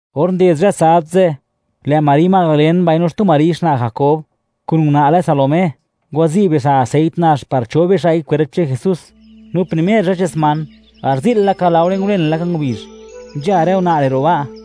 Or nded zhë sabd ze', lë' Mari Madalen mbaino xtu Mari xna' Jakob, kun una' lë Salomé; ngwazi' bixa' aseit nax par chob bixa'i kwerp che'n Jesús. No primer zhë che'n sman, garzi'l laka laore ngulen laka ngubizh, nzha rë una' re' ro' ba'.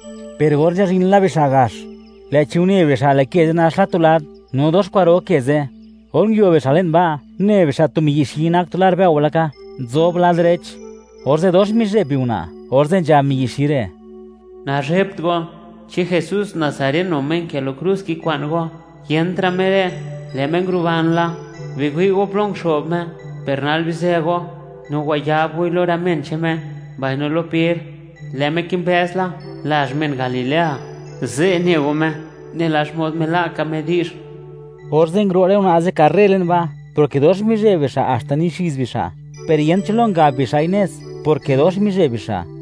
Per or nzhazhin la bixa' gax, lë'chi une bixa', lë' ke ze' nax la tu lad. No dox kwa'ro ke ze'. Or nguio bixa' le'n ba', une bixa' tu miyi' xi nak tu lar bëo laka, nzob lad derech; orze' dox mizhe'b biuna', orze' nzhab miyi' xi re': ―Nazhebt go. ¿Chi Jesús Nazareno, Me nkë lo krus, kikwa'n go? Yentra' Me re', lë' Me nguruban la. Biwi' go plo nguxo'b Me. Per nal bizë go, no wayab goi lo rë men che'n Me, mbaino lo Per; lë' Me kimbëz la lazh che'n men Galilea; ze' ne go Me, nela xmod mila' ka Me di'zh. Orze' nguro' rë una' ze' karre le'n ba', porke dox mizheb bixa' haxta nixiz bixa'; per yent cho lo ngab bixa'i nez, porke dox mizheb bixa'.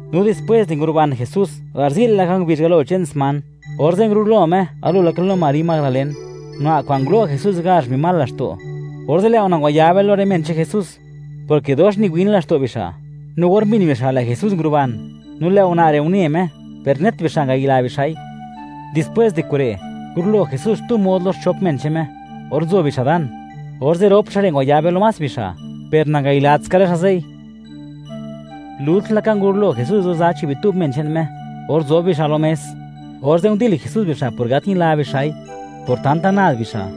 No dispwes di nguruban Jesús garzi'l laka ngubizh galo che'n sman, orze' ngurulo Me galo laka lo Mari Madalen, una' kwa'n ngulo' Jesús gazh mbi mal laxto'. Orze' lë' una' ngwayabe lo rë men che'n Jesús, porke dox niwin laxto' bixa'. No or mbin bixa', lë' Jesús nguruban, no lë' una' re' une Me; per net bixa' ngayila bixa'i. Dispwés di kure', ngurulo Jesús xtu mod lo xchop men che'n Me, or nzo bixa' dan. Orze', rop xa' re' ngwayabe lo más bixa', per nangayilatska rë xa' ze'i. Lult laka ngurulo Jesús lo za chi' bitub men che'n Me or nzob bixa' lo mes; orze' ndil Jesús bixa' por gat ñila bixa'i, por tanta nad bixa',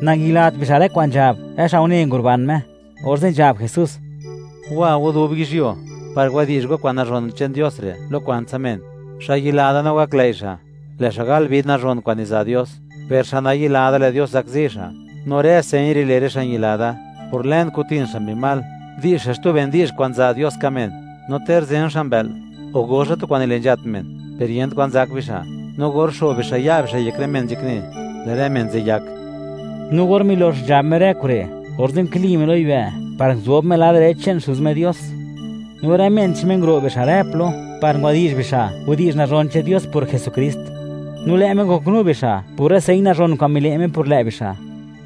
nangayilat bixa' rë kwa'n nzhab, rë xa' une nguruban Me. Orze' nzhab Jesús: ―Wa go dub yizhyuo, par wadi'zh go kwa'n nazhon che'n Dios re', lo kwantsa men. Xa' yila da no gaklëi' xa', lë' xa' gal vid nazhon kwa'n niza' Dios; per xa' nayila da, lë' Dios zakzi xa'. No rë señ re' le' rë xa' ñila da: Por lën, kutin xa' mbi mal; di'zh xa' xtu ben di'zh kwa'n za' Dios ka' men; no ter zen xa' mbë'l, o go xa' tu kwa'n nile' nzhat men, per yent kwa'n zak bixa'; no or xo'b bixa' ya' bixa' yek rë men nzhakne, lë' rë men ze' yak. No or milox nzhab Me rë kure', orze' nkili Me lo yibë' par nguzob Me lad derech che'n Xuz Me Dios. No rë men che'n Me, nguro' bixa' rë plo, par ngwadi'zh bixa' widi'zh nazhon che'n Dios por Jesukrist. No lë' Me ngoknu bixa' por rë señ nazhon kwa'n mile' Me por lë' bixa'.